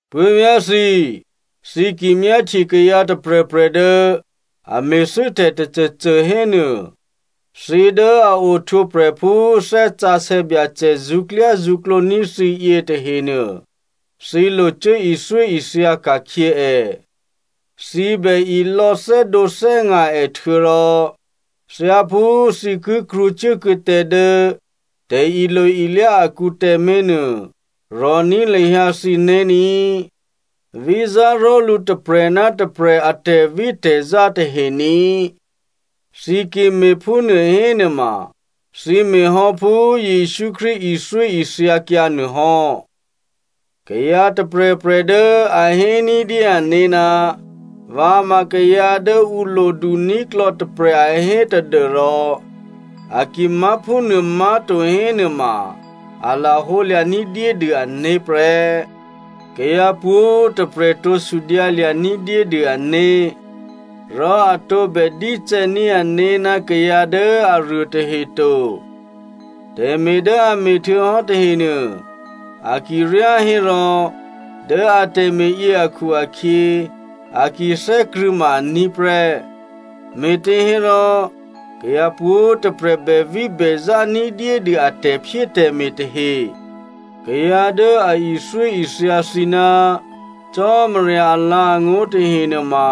Puố̤vyá̤ thǐ꤮, thǐ ki myáhtye kayǎ tôprè̤prè̤ dố a me̤thû́ tè̤ tôcôcô hénuô, thǐ dố a ohtwǒprè̤ phú Thè́ Sǎsè̌ Byacè zṳ̌klyázṳ̌klǒ ní̤ thǐ yě tahenuô, thǐ lo cuố ithyóithya ka̤khyě è. Thǐ bè ilò̌ thè́dǒthè́nga̤ è htuô̌rò thyáphú thǐ ki krwǒcuốkuô̌ tǎ dố tè̤ilo-ilyá akǔ tǎmé̤ nuô, rò̤ní̤ lahyǎ thǐné̤ ní꤮. Vízá ró̤lǔ tôprè̤ ná tôprè̤ a tè̤vítè̤zá tahe ní꤮. Thǐ ki me̤phúnuô hénuôma thǐ me̤ hò́ phú Jesǔ Krístu ithyóithyakyǎ nuôhò́. Kayǎ tôprè̤prè̤ dố a hé ní̤dyé ané̤, vǎ ma kayǎ dố ǔ loduní̤klò̌ tôprè̤ a hé tadû́rò a ki má̤ phúnuô má̤to hénuôma a lahǒ lya̤ ní̤dyédû ané̤ prè́. Kayǎ pwǒ̤꤮ tôprè̤ tǒ sudyǎlya̤ ní̤dyédû ané̤. Rò a tǒbè dícè̌ní̤ ané̤ ná kayǎ dố aruô tahe to. Tè̤me̤ dố a me̤htuô̌hò́ tahenuô a ki ryá hérò dố a tè̤me̤yě akhu-akhyě, a ki thè́krṳ̂̌ ma aní̤ prè́. Me̤těhérò kayǎ pwǒ̤꤮ tôprè̤ bèvíbèzá ní̤dyédû a tè̤phyétè̤me̤ tahe. Kayǎ dố a ithyóithya thǐ ná Cò́marya alǎ̤angó̤ tahe nuôma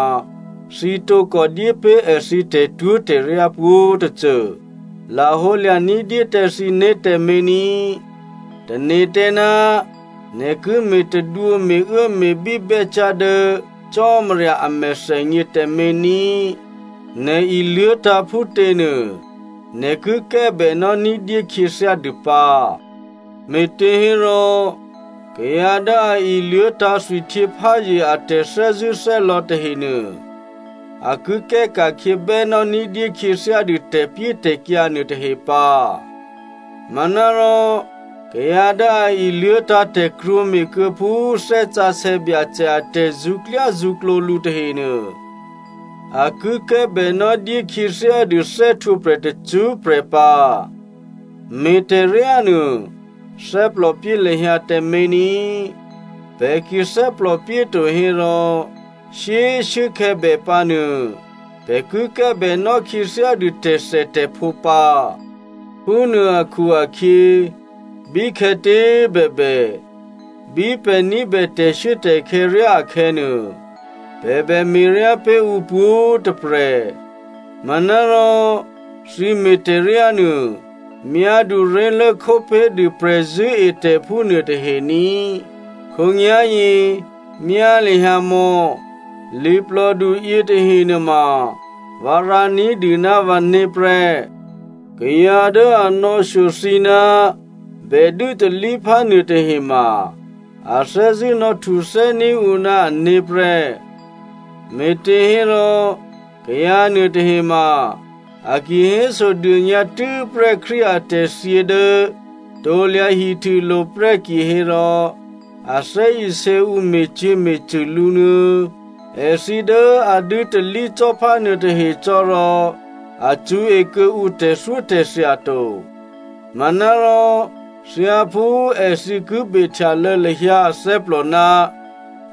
thǐ tǒkò dyé pé̤ èthǐ tè̤twó̤tè̤ryá pwǒ̤tôcô. Lahǒlya̤ ní̤dyé tǎ thǐné̤ tǎmé̤ ní꤮. Tane̤ tǎ ná nè̤ ki me̤tadwǒ me̤uốme̤bí bè́cyá̤ dố Cò́marya a mèthènyě tǎmé̤ ní꤮. Nè̤ iluố̤tǎ̤ phútěnuô, nè̤ ki kè́bènò́ ní̤dyé khyěthyádû pǎ. Me̤těhérò kayǎ dố a iluố̤tǎ̤ thwihtyěpházye a tè̤thè́zṳ̂́thè́lò̌ tahenuô, a ki kè́ ka̤khyě bènò́ ní̤dyé khyěthyádû tè̤pyétè̤kyǎ nuôtahe pǎ. Manárò kayǎ dố a iluố̤tǎ̤ tè̤krwǒme̤kuô̌ phú Thè́ Sǎsè̌ Byacè a tè̤zṳ̌klyázṳ̌klǒ lǔ tahenuô, a ki kè́bènò́ dyékhyěthyádû thè́htwǒprè̤ tacṳ́prè̤ pǎ. Me̤tè̤ryánuô thè́plòpyé lahyǎ tǎmé̤ ní꤮. Pè̤ ki thè́plòpyéto hérò, shyé꤮ shuốkhè̌ bè pǎnuô, pè̤ ki kè́bènò́ khyěthyádû tè̤thètè̤phǒ pǎ. Phúnuô akhu-akhyě bíkhè̌tě꤮ bèbè, bí pè̤ ní̤bè tè̤shuốtè̤khè̌ ryá akhè̌nuô, pè̤ bè me̤ryá pé̤ ǔ pwǒ̤꤮ tôprè̤. Manárò thǐ me̤tè̤ryánuô myáduré̤lố khópé̤dû prè̤zṳ̂́etè̤phú nuôtahe ní꤮. Khǒnyá̤yě, myá lahyǎ mò̌! Liplòdu yětahe nuôma vǎ rǎ ní̤dû ná vǎné̤ prè́. Kayǎ dố a nò̌shyo thǐ ná bè dû́talíphá nuôtahema a thè́zṳ̂́ nò̌htuthè́ní̤ ǔ ná ané̤ prè́. Me̤těhérò kayǎ nuôtahema a ki hésodônyǎ tû́prè́ Krístu atè̤thyě dố krusulo̤ prè́ kihérò a thè́isě ǔ me̤cyě̤me̤cṳ̂ lǔnuô̌. Èthǐ dố a dû́talí cò́phá nuôtahe cò́ rò a cṳ̌e kuô̌ǔ tè̤thyótè̤thya to. Manárò thyáphú èthǐ ki behtyalô̌ lahyǎ athè́plò ná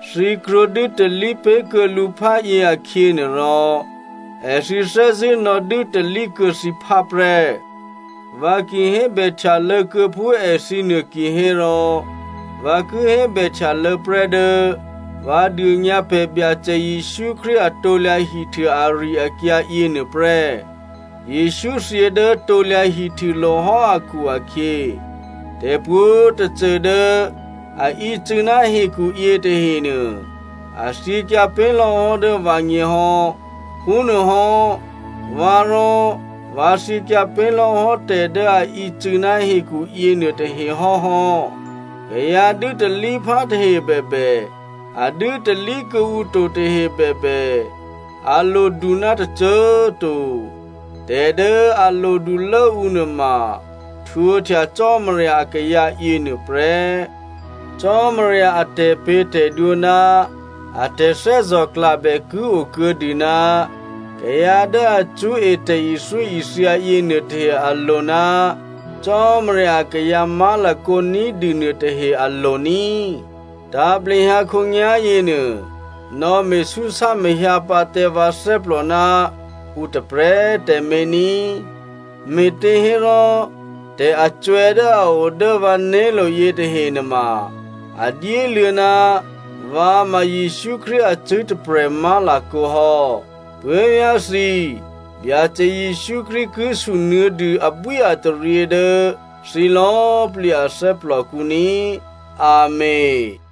thǐ krwǒ dû́talí pé̤ kuô̌ lǔ phá yě akhyě nuôrò, èthǐ thè́zṳ̂́ nò̌dû́talí kuô̌ thǐphá prè́. Vǎ ki hébèhtyalô̌ kuô̌ phú èthǐnuô kihérò, vǎ ki hébèhtyalô̌ prè́ dố vǎ dônyǎ pè̤ Byacè Jesǔ Krístu a krusu ari-akyǎ yěnuô prè́. Jesǔ thyě dố krusulo̤ hò́ akhu-akhyě, tè̤pwǒ̤꤮ tôcô dố a ícû̌ ná hekhu yětahenuô, a thyěkyǎ pé̤lò̌hò́ dố vǎgněhò́, phúnuôhò́, vǎ rò vǎ thyěkyǎ pé̤lò̌hò́ tè̤dố a ícû̌ ná hekhu yěnuôtahe hò́hò́. Kayǎ dû́talíphá tahe bèbè, a dû́talí kuô̌ǔ to tahe bèbè a lodu ná tôcô꤮ to. Tè̤dố a lodulốǔ nuôma htwǒhtya Cò́marya akayǎ yěnuô prè́. Cò́marya a tè̤pě̤tè̤dwǒ ná a tè̤thè́zò̤klabè ki o kuô̌dû ná kayǎ dố a cṳ̌e tè̤ithyóithya yěnuô tahe alo̤ ná Cò́marya akayǎ má̤lakǒ ní̤dû nuôtahe alo̤ ní꤮. Tǎ̤plehyǎ khǒnyá̤ yěnuô, nò̌ me̤súsámahyǎ pǎ tǎ vǎ thè́plò ná ǔ tôprè̤꤮ tǎmé̤ ní꤮, me̤těhérò tè̤acwè̌ dố a o dố vǎné̤lo̤ yětahe nuôma, a dyéluô̌ ná vǎ ma Jesǔ Krístu acṳ̂́ tôprè̤ má̤lakǒ hò́. Puố̤vyá̤ thǐ꤮, Byacè Jesǔ Krístu ki sunuô̌dû abwíataryě dố thǐ lò̌꤮ plǐ a thè́plòkǔ ní꤮. Amèn.